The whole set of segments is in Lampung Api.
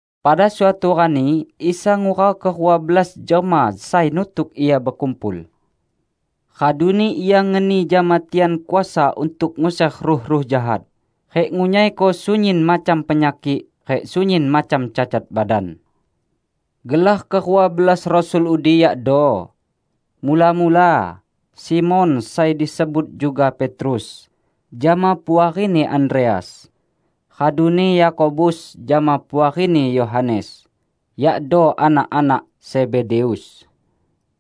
Pada suatu rani Isa ngurau kerua belas jelma sai nutuk Ia bekumpul. Raduni Ia ngeni jama tian kuasa untuk nguser ruh-ruh jahat rik ngunyaiko sunyin macam penyakik rik sunyin macam cacat badan. Gelar kerua belas rasul udi yakdo: mula-mula, Simon (sai disebut juga Petrus) jama puarini Andreas, raduni Yakobus jama puarini Yohanes, yakdo anak-anak Zebedeus.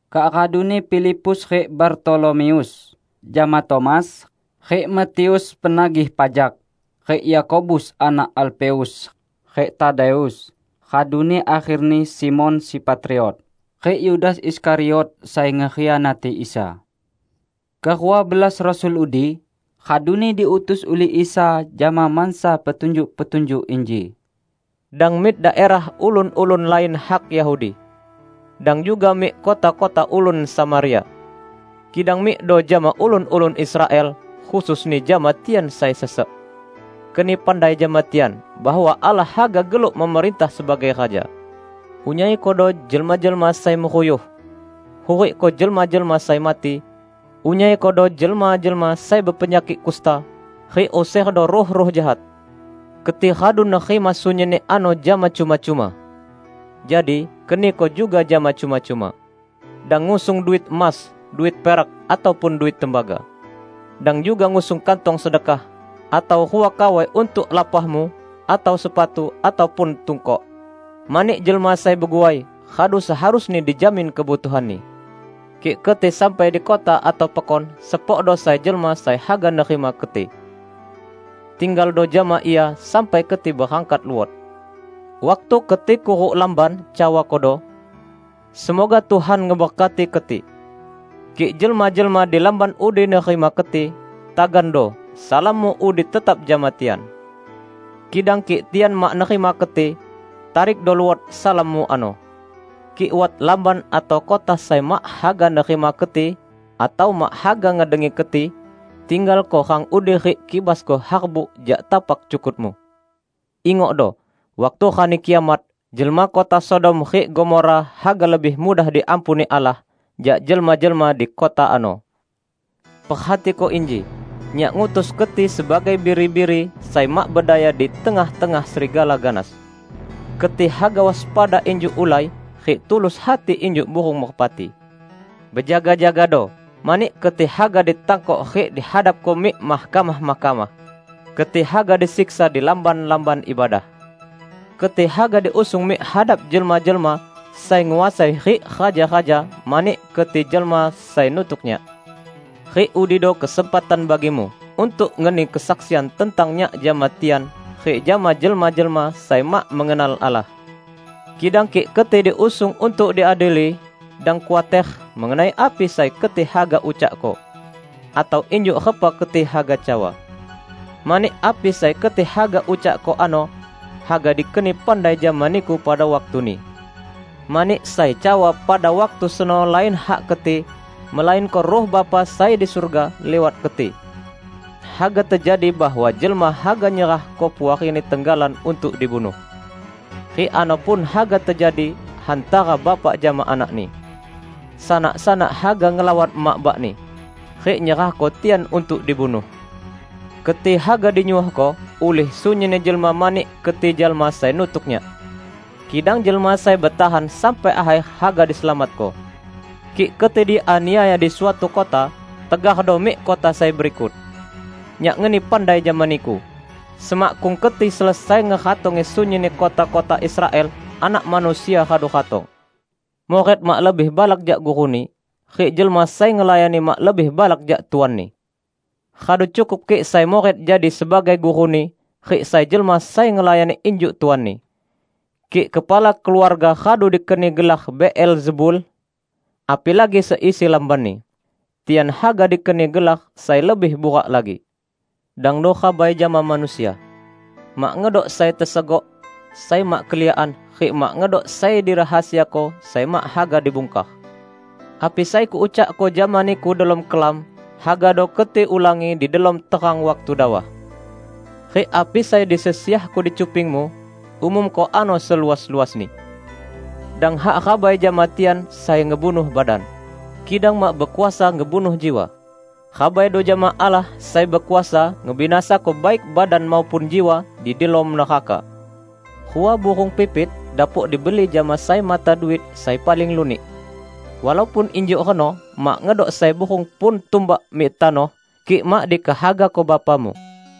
Kak raduni Filipus rik Bartolomeus, jama Tomas, rik Matius, penagih pajak rik Yakobus anak Alfeus, rik Tadeus; raduni akherni Simon, si Patriot rik Yudas Iskariot sai ngekhianati Isa. Kerua belas rasul udi raduni diutus ulih Isa jama mansa petunjuk-petunjuk inji, "Dang mik daerah ulun-ulun lain hak Yahudi. Dang juga mik kota-kota ulun Samaria. Kidang mikdo jama ulun-ulun Israel, khususni jama tian sai sesek. Keni pandai jama tian bahwa Allah haga geluk memerintah sebagai Raja. Unyaikodo jelma-jelma sai meruyuh; hurikko jelma-jelma sai mati; unyaikodo jelma-jelma sai bepenyakik kusta, rik userdo ruh-ruh jahat. Keti radu nerima sunyinni ano jama cuma-cuma. Jadi, keniko juga jama cuma-cuma. Dang ngusung duit emas, duit perak, ataupun duit tembaga. Dang juga ngusung kantong sedekah, atau rua kawai untuk lapahmu, atau sepatu, ataupun tungkok. Mani jelma sai beguai, radu seharusni dijamin kebutuhanni. Kik keti sampai di kota atau pekon, sepokdo sai jelma sai haga nerima keti. Tinggaldo jama ia sampai keti berangkat luot. Waktu keti kuruk lamban, cawakodo, 'Semoga Tuhan ngeberkati keti.' Kik jelma-jelma di lamban udi nerima keti, tagando salammu udi tetap jama tian. Kidang kik tian mak nerima keti, tarikdo luot salammu ano. Kik wat lamban atau kota sai mak haga nerima keti atau mak haga ngedengi keti, tinggalko rang udi rik kibasko harbuk jak tapak cukutmu. Ingokdo! Waktu Rani Kiamat, jelma kota Sodom rik Gomora haga lebih mudah diampuni Allah, jak jelma-jelma di kota ano!" "Perhatiko inji: Nyak ngutus keti sebagai biri-biri sai mak bedaya di tengah-tengah serigala ganas. Keti haga waspada injuk ulai rik tulus hati injuk burung merpati. Bejaga-jagado, mani keti haga ditangkok rik dihadapko mik mahkamah-mahkamah. Keti haga disiksa di lamban-lamban ibadah. Keti haga diusung mik hadap jelma-jelma sai nguasai rik raja-raja mani keti jelma sai nutuk Nyak. Rik udido kesempatan bagimu untuk ngeni kesaksian tentang Nyak jama tian rik jama jelma-jelma sai mak mengenal Allah. Kidang kik keti diusung untuk diadili, dang khuater mengenai api sai keti haga ucakko, atau injuk repa keti haga cawa. Mani api sai keti haga ucakko ano, haga dikeni pandai jama niku pada waktuni. Mani sai cawa pada waktu seno lain hak keti, melainko Ruh Bapa sai di surga, liwat keti. Haga tejadi bahwa jelma haga nyerahko puarini tenggalan untuk dibunuh. Rik ano pun haga tejadi hantara bapak jama anakni. Sanak-sanak haga ngelawan emak bakni, rik nyerahko tian untuk dibunuh. Keti haga dinyuohko ulih sunyinni jelma mani keti jelma sai nutuk Nyak. Kidang jelma sai betahan sampai akher haga diselamatko. Kik keti dianiaya di suatu kota, tegardo mik kota sai berikut. Nyak ngeni pandai jama niku: Semakkung keti selesai ngeratongi sunyinni kota-kota Israel, Anak Manusia radu ratong. Murid mak lebih balak jak guruni, rik jelma sai ngelayani mak lebih balak jak tuanni. Radu cukup kik sai murid jadi sebagai guruni, rik sai jelma sai ngelayani injuk tuanni. Kik kepala keluarga radu dikeni gelar Beelzebul, apilagi seisi lambanni. Tian haga dikeni gelar sai lebih burak lagi!" "Dangdo rabai jama manusia. Mak ngedok sai tesegok, sai mak keliakan, rik mak ngedok sai dirahasiako sai mak haga dibungkar. Api sai Kuucakko jama niku delom kelam hagado keti ulangi di delom terang waktu dawah. Rik api sai disesiahko di cupingmu, umumko ano seluas-luasni! Dang hak rabai jama tian sai ngebunuh badan, kidang mak bekuasa ngebunuh jiwa. Rabaido jama Allah sai bekuasa ngebinasako baik badan maupun jiwa di delom neraka. Rua burung pipit dapok dibeli jama sai mata duit sai paling lunik. Walaupun injuk reno mak ngedok sai burung pun tumbak mik tanoh kik mak dikehagako Bapamu.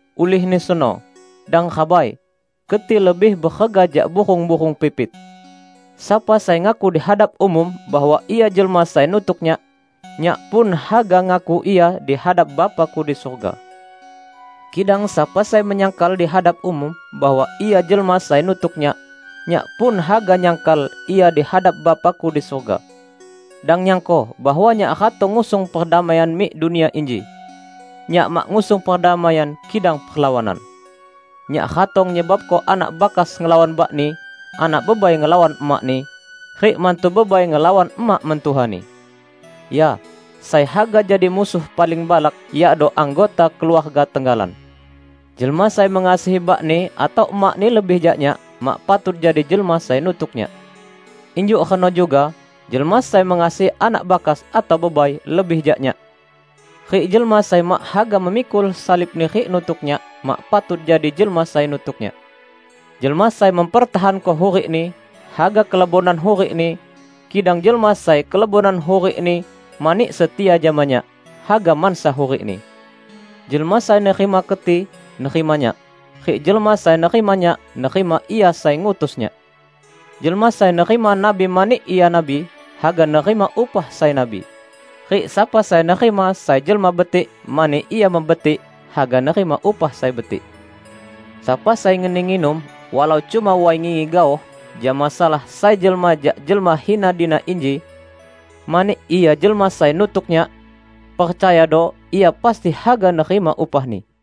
Ulihni seno, dang rabai! Keti lebih berega jak burung-burung pipit!" "Sapa sai ngaku dihadap umum bahwa ia jelma sai nutuk Nyak, Nyak pun haga ngaku ia dihadap Bapa-Ku di surga. Kidang sapa sai menyangkal dihadap umum bahwa ia jelma sai nutuk Nyak, Nyak pun haga nyangkal ia dihadap Bapa-Ku di surga." "Dang nyangko bahwa Nyak ratong ngusung perdamaian mik dunia inji. Nyak mak ngusung perdamaian kidang perlawanan. Nyak ratong nyebabko anak bakas ngelawan bakni, anak bebai ngelawan emakni, rik mantu bebai ngelawan emak mentuhani. Ya, sai haga jadi musuh paling balak, yakdo anggota keluarga tenggalan. Jelma sai mengasihi bakni atau emakni lebih jak Nyak mak patut jadi jelma sai nutuk Nyak. Injuk reno juga jelma sai mengasihi anak bakas atau bebai lebih jak Nyak. Rik jelma sai mak haga memikul salibni rik nutuk Nyak mak patut jadi jelma sai nutuk Nyak. Jelma sai mempertahanko hurikni, haga kelebonan hurikni, kidang jelma sai kelebonan hurikni mani setia jama Nyak, haga mansa hurikni." "Jelma sai nerima keti, nerima Nyak. Rik jelma sai nerima Nyak, nerima Ia sai ngutus Nyak. Jelma sai nerima nabi mani ia nabi, haga nerima upah sai nabi. Rik sapa sai nerima sai jelma betik mani ia mebetik, haga nerima upah sai betik. Sapa sai ngeni nginum, walau cuma way ngingi gaoh jama salah sai jelma jak jelma hina dina inji, mani ia jelma sai nutuk Nyak, percayado ia pasti haga nerima upahni!"